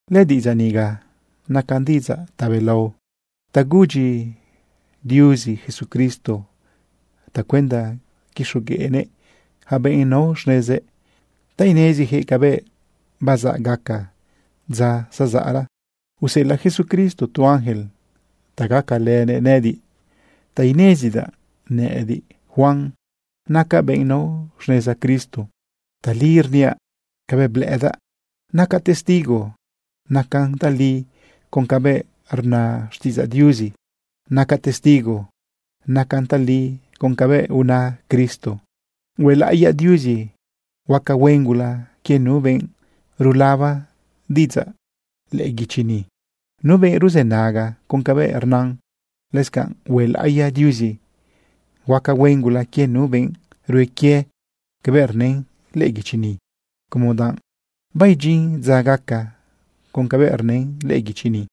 Lëdiꞌidzaꞌ niga nacan diꞌidzaꞌ tabelao ta gudyi Diuzi Jesucristo tacuenda quixogueꞌnëꞌ ja benꞌ nao xnezëꞌ ta inezijëꞌ cabëꞌ bazaꞌ gaca dza zazaꞌra. Useꞌelaꞌ Jesucristo tu ángel ta gacalënëꞌ nëꞌëdiꞌ ta inezidaꞌ nëꞌëdiꞌ, Juan, nacaꞌ benꞌ nao xneza Cristo. Tali rniaꞌ cabëꞌ blëꞌëdaꞌ. Nacaꞌ testigo nacan tali con cabëꞌ rna xtiꞌidzaꞌ Diuzi. Nacaꞌ testigo nacan tali con cabëꞌ una Cristo. Huelaꞌiya Diuzi huaca huen gula quie nu benꞌ rulaba diꞌidzaꞌ lëꞌë guichi ni, nu benꞌ ruzënaga con cabëꞌ rnan. Lëscanꞌ huelaꞌiya Diuzi huaca huen gula quie nu benꞌ rue quie cabëꞌ rnën lëꞌë guichi ni, como danꞌ baidyin dza gaca con cabëꞌ rnën lëꞌë guichi ni.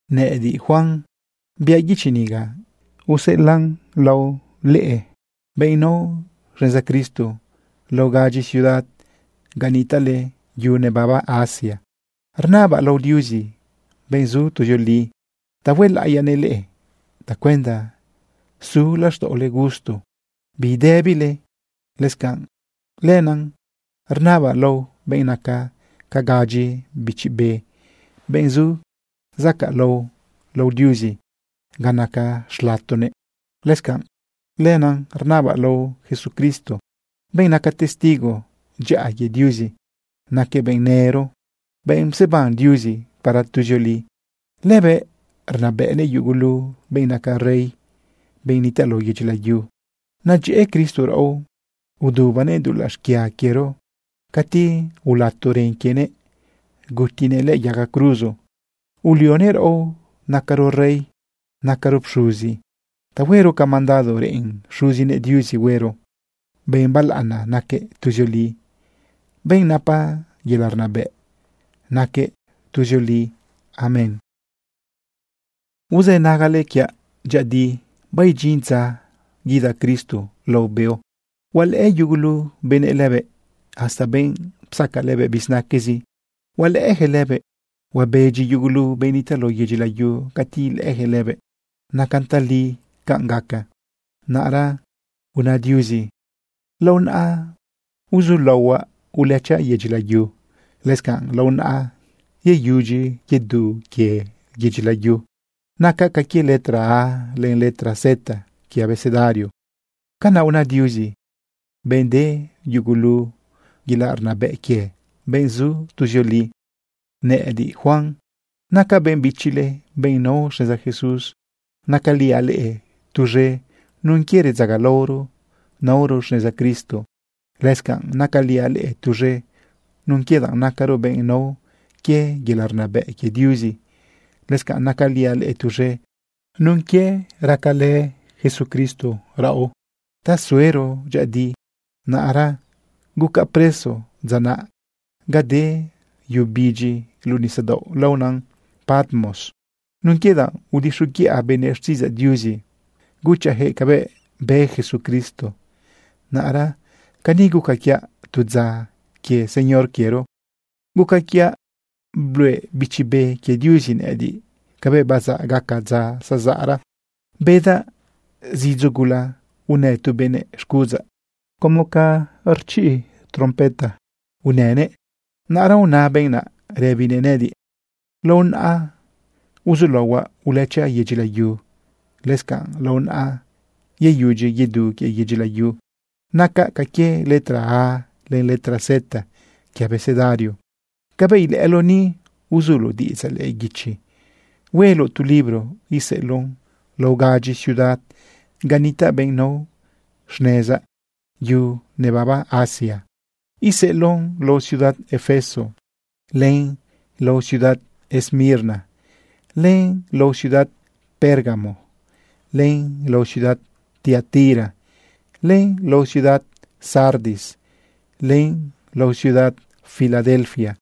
Nëꞌëdiꞌ, Juan, biaꞌ guichi niga useꞌelaꞌn lao leꞌe, benꞌ nao xneza Cristo lao gadyi ciudad ga nitaꞌle yu nebaba Asia. Rnabaꞌ lao Diuzi, benꞌ zu tuzioli, ta huelaꞌiyanëꞌ leꞌe tacuenda su laxtaꞌole gusto bidëbile. Lëscanꞌ lenaꞌ rnabaꞌ lao benꞌ naca ca gadyi bichi be, benꞌ zu zacaꞌlao lao Diuzi ga naca xlatonëꞌ. Lëscanꞌ lenaꞌ rnabaꞌ lao Jesucristo, benꞌ naca testigo dyaꞌa quie Diuzi. Naquëꞌ benꞌ nëro, benꞌ pseban Diuzi para tuzioli. Lëbëꞌ rnabëꞌnëꞌ yugulu benꞌ naca rey, benꞌ nitaꞌ lao yedyi layu. Nedyëꞌë Cristo raꞌo udubanëꞌ dulaꞌ xquia quiero cati ulato ren quienëꞌ gutinëꞌ lëꞌë yaga cruzo. Ulionëꞌ raꞌo nacaro rey, nacaro pxuzi ta huero ca mandado reꞌen Xuzinëꞌ Diuzi huero. Benꞌ balaꞌana naquëꞌ tuzioli. Benꞌ napa yelaꞌ rnabëꞌ naquëꞌ tuzioli. Amén. Uzë nagale quiaꞌ dyëꞌëdi. Baidyin dza guida Cristo lao beo. Hualëꞌë yugulu benëꞌ lëbëꞌ. Hasta benꞌ psaca lëbëꞌ bizinaquezi hualëꞌëjëꞌ lëbëꞌ. Huabedyi yugulu benꞌ nitaꞌ lao yedyi layu cati ilëꞌëjëꞌ lëbëꞌ. Nacan tali canꞌ gaca. Naꞌra una Diuzi: “Lao naꞌa uzulaohuaꞌ ulëchaꞌ yedyi layu. Lëscanꞌ lao naꞌa yeyudyi yedu quie yedyi layu. Nacaꞌ ca quie letra A len letra Z quie abecedario.” Canaꞌ una Diuzi, benꞌ de yugulu yelaꞌ rnabëꞌ quie, benꞌ zu tuzioli. Nëꞌëdiꞌ, Juan, nacaꞌ benꞌ bichile, benꞌ nao xneza Jesús. Nacaliaꞌ leꞌe tuz̃e nun quie redzagalaoro naoro xneza Cristo. Lëscanꞌ nacaliaꞌ leꞌe tuz̃e nun quie danꞌ nacaro benꞌ nao quie yelaꞌ rnabëꞌ quie Diuzi. Lëscanꞌ nacaliaꞌ leꞌe tuz̃e nun quie racalë Jesucristo raꞌo ta suero dyëꞌëdi. Naꞌra gucaꞌ preso dza naꞌ ga de yu bidyi luꞌu nisadaoꞌ laona Patmos nun quie danꞌ udixoguiꞌa benëꞌ xtiꞌidzaꞌ Diuzi guchaꞌjëꞌ cabëꞌ bë Jesucristo. Naꞌra cani guca quiaꞌ tu dza quie Señor quiero. Guca quiaꞌ bluꞌe Bichi Be quie Diuzi nëꞌëdiꞌ cabëꞌ bazaꞌ gaca dza zazaꞌra. Bedaꞌ zidzo gula unë tu benëꞌ xcuꞌudzaꞌ. Como ca rchiꞌ trompeta unënëꞌ. Naꞌra una benꞌ naꞌ rëbinëꞌ nëꞌëdiꞌ: ―Lao naꞌa uzulaohuaꞌ ulëchaꞌ yedyi layu. Lëscanꞌ lao naꞌa yeyudyi yedu quie yedyi layu. Nacaꞌ ca quie letra A len letra Z quie abecedario. Cabëꞌ ilëꞌëloꞌ ni, uzuloꞌ diꞌidzaꞌ lëꞌë guichi, hueloꞌ tu libro iseꞌeloꞌn lao gadyi ciudad ga nitaꞌ benꞌ nao xnezaꞌ yu nebaba Asia. Iseꞌeloꞌn lao ciudad Efeso, len lao ciudad Esmirna, len lao ciudad Pérgamo, len lao ciudad Tiatira, len lao ciudad Sardis, len lao ciudad Filadelfia,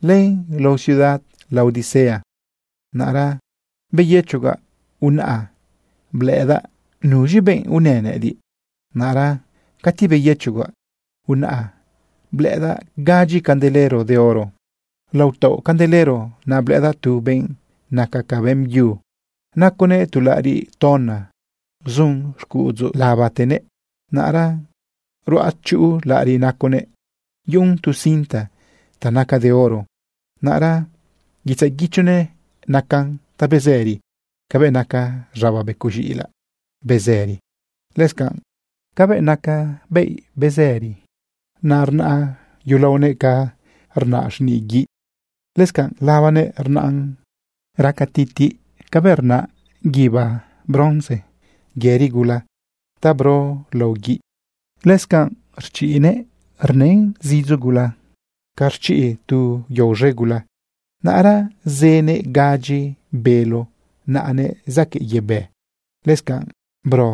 len lao ciudad Laodicea. Naꞌra beyëchogaꞌ unaꞌa blëꞌëdaꞌ nuz̃i benꞌ unë nëꞌëdiꞌ. Naꞌra cati beyëchogaꞌ, unaꞌa blëꞌëdaꞌ gadyi candelero de oro. Lao taoꞌ candelero naꞌ, blëꞌëdaꞌ tu benꞌ naca ca beꞌmbyu. Naconëꞌ tu laꞌariꞌ tona zun xcuꞌudzu labatenëꞌ. Naꞌra ruꞌachuꞌu laꞌariꞌ naconëꞌ, yuꞌun tu cinta ta naca de oro. Naꞌra guitzaꞌ guichonëꞌ nacan ta bezëri cabëꞌ naca z̃aba becoꞌ z̃iꞌilaꞌ bezëri, lëscanꞌ cabëꞌ naca yelo bezëri. Naꞌ rnaꞌ yulaonëꞌ ca rnaꞌ xniꞌ guiꞌ. Lëscanꞌ labanëꞌ rnaꞌn raca titiꞌ cabëꞌ rnaꞌ guíba bronce yëri gula ta bro lao guiꞌ. Lëscanꞌ rchiꞌnëꞌ rnan zidzo gula ca rchiꞌ tu yao z̃e gula. Naꞌra zënëꞌ gadyi bélo naꞌanëꞌ zaquëꞌ yebë. Lëscanꞌ bro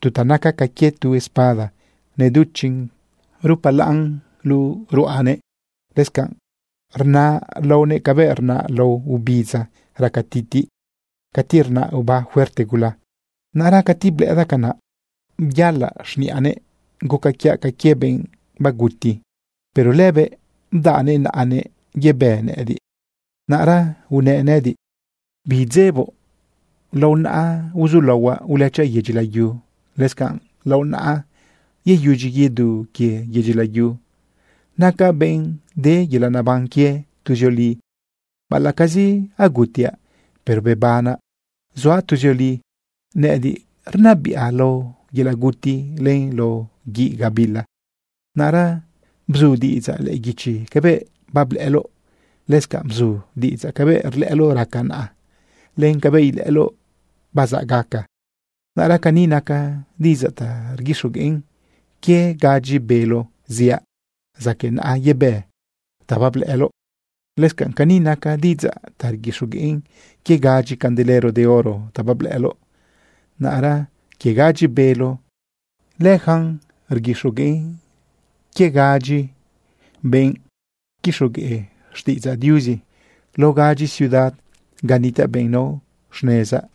tu ta naca ca quie tu espada neduchiꞌn rupalaꞌn luꞌu ruꞌanëꞌ. Lëscanꞌ rnaꞌ laonëꞌ cabëꞌ rnaꞌ lao ubidza raca titiꞌ cati rnaꞌ oba fuerte gula. Naꞌra cati blëꞌëdaꞌ canaꞌ, byalaꞌ xniꞌanëꞌ guca quiaꞌ ca quie benꞌ baguti. Pero lëbëꞌ bdaꞌnëꞌ naꞌanëꞌ yebë nëꞌëdiꞌ. Naꞌra unëꞌ nëꞌëdiꞌ: ―Bidzeboꞌ. Lao naꞌa uzulaohuaꞌ ulëchaꞌ yedyi layu. Lëscanꞌ lao naꞌa yeyudyi yedu quie yedyi layu. Nacaꞌ benꞌ de yelaꞌ neban quie tuzioli. Baꞌalaꞌcazi agutiaꞌ, pero bebanaꞌ zuaꞌ tuzioli. Nëꞌëdiꞌ rnabiꞌa lao yelaꞌ guti len lao guiꞌ gabila. Naꞌra bzu diꞌidzaꞌ lëꞌë guichi cabëꞌ bablëꞌëloꞌ. Lëscanꞌ bzu diꞌidzaꞌ cabëꞌ rlëꞌëloꞌ raca naꞌa, len cabëꞌ ilëꞌëloꞌ bazaꞌ gaca. Naꞌra cani naca diꞌidzaꞌ ta rguixogueꞌn quie gadyi bélo ziaꞌ zaquëꞌ naꞌa yebë ta bablëꞌëloꞌ. Lëscanꞌ cani naca diꞌidzaꞌ ta rguixogueꞌn quie gadyi candelero de oro ta bablëꞌëloꞌ. Naꞌra quie gadyi bélo, leyacan rguixogueꞌn quie gadyi benꞌ quixogueꞌ xtiꞌidzaꞌ Diuzi lao gadyi ciudad ga nitaꞌ benꞌ nao xnezaꞌ.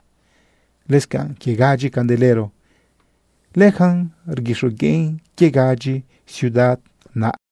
Lëscanꞌ quie gadyi candelero, leyacan rguixogueꞌn quie gadyi ciudad naꞌ.